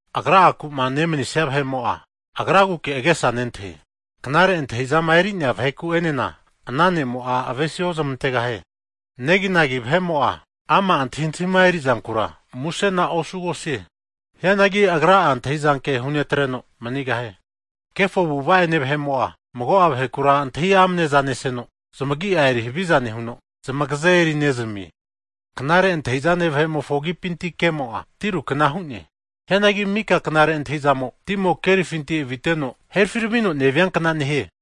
Agra'aku'ma nemanisia vahe'mo'a, agraguke agesa nentahie. Knare antahizama eri'nea vaheku'enena ana ne'mo'a avesiozmantegahie. Neginagi vahe'mo'a ama' antahintahima erizankura, musena osugosie. Hianagi agra'a antahi'zanke hu'netreno manigahie. Kefo avu'ava'ene vahe'mo'a, mago'a vahekura antahi amane'za neseno, zmagi'a eri haviza nehuno, zmagaze eri'nezamie. Knare antahizane vahe'mofo agipinti kemo'a, tiru kna hu'ne. Hianagi mika knare antahizamo, timo kerifinti aviteno herafiramino neviankna nehie.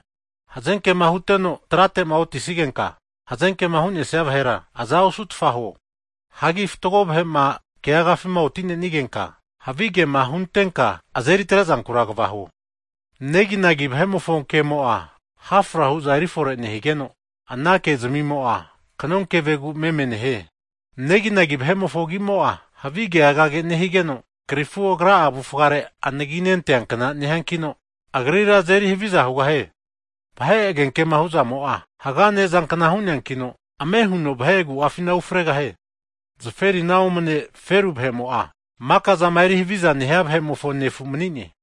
Hazenkema huteno trate'ma otisigenka, hazenkema hu'nesia vahera aza osutfa huo. Hagi fatgo vahe'ma keagafima oti'nenigenka havigema huntenka azeri atre'zankura kva huo. Neginagi vahe'mofo kemo'a, hafra hu'za eri fore nehigeno, ana ke'zmimo'a kanonkevegu meme nehie. Neginagi vahe'mofo agi'mo'a, havi ke'agage nehanigeno, krifu agra'a avufare anaginente'ankna nehiakino, agrira azeri haviza hugahie. Vahe agenkema hu'zamo'a, haga ne'zankna hu'neankino, ame huno vahe agu'afina ufregahie. Zaferina omane feru vahe'mo'a, makazama eri havizama nehia vahe'mofo nefu manine.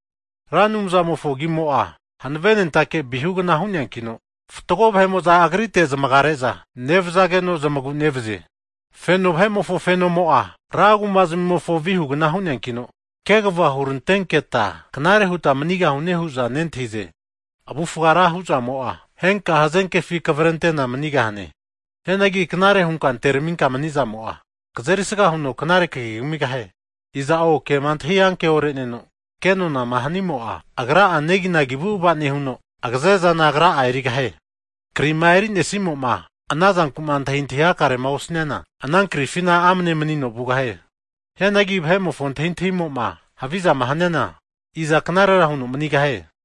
Ra Anumzamofo agimo'a hanavenentake vihugna hu'neankino, fatgo vahe'mo'za agritega zamagare'za nevazageno, zamagu nevazie. Feno vahe'mofo fenomo'a ra kuma zmimofo vihugna hu'neakino, kegva hurantenkenta knare huta manigahune hu'za nentahize. Avufga ra hu'zamo'a, henka hazenkefi kavrentena manigahane. Hianagi knare hunka anteraminka mani'zamo'a, kazerisga huno knare kagi kamigahie. Iza'o kema antahi anke ore'neno ke'nonama hanimo'a, agra neginagi avu'ava nehuno agaze zana agra'a erigahie. Krima eri'nesimo'ma ana zankuma antahintahi hakarema osaniana, ana krifina amane manino vugahie. Hianagi vahe'mofo antahintahimoma havizama haniana, iza knarera huno manigahie?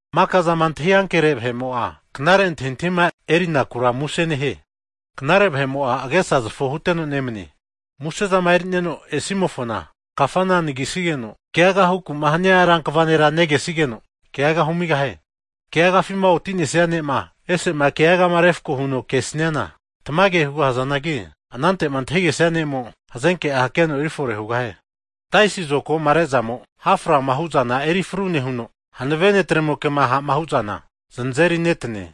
Maka'zama antahi ankere vahe'mo'a, knare antahintahima erinakura muse nehie. Knare vahe'mo'a agesazofo huteno nemanie. Musezama eri'neno esimofona, kafana anagisigeno keagama hukuma hania rankva nera negesigeno, keaga humigahie. Keagafima otinesia ne'ma ese'ma keagama refkoma huno kesiana tamage hugahazanagi, anantema antahigesia ne'mo, hazenke'a keno erifore hugahie. Taisi zokagoma re'zamo ha frama hu'zana eri fru nehuno, hanave netremoke'ma ha'ma hu'zana zanazeri netane.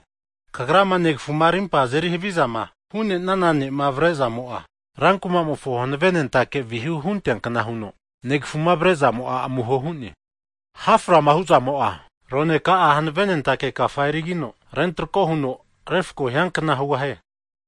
Kagrama negafu'ma arimpama azeri havizama hu'nenana ne'ma avare'zamo'a, rankumamofo hanavenentake vihu hunteankna huno negafu'ma avare'zamo'a amuho hu'ne. Ha' frama hu'zamo'a, rone ka'a hanavenentake kafa erigino rentroko huno, refko hiankna hugahie.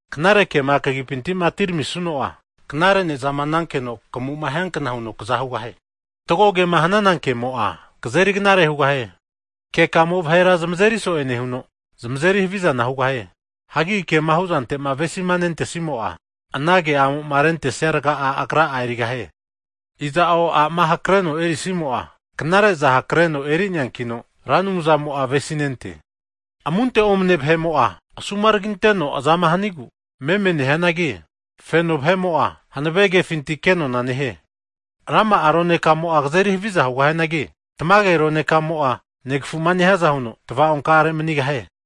Knare kema kagipintima atiramisuno'a, knare ne'zama nankeno kamuma hiankna huno kaza hugahie. Fatgo kema hanana kemo'a, kazeri knare hugahie. Kekamo'a vahera zmazeri so'e nehuno, zmazeri havizana hugahie. Hagi kema huzantema avesima nentesimo'a, ana ke'amoma rentesia rga'a agra'a erigahie. Iza'o a'ma hakreno erinesimo'a, knare'za hakreno eri'neankino, Ra Anumzamo'a avesinente. Amunte omane vahe'mo'a, asumaraginteno azama hanigu meme nehianagi, feno vahe'mo'a, hanave kefinti kenona nehie. Rama'a ronekamo'a kazeri haviza hugahianagi, tamage ronekamo'a negafuma nehiaza huno tava'onkare manigahie.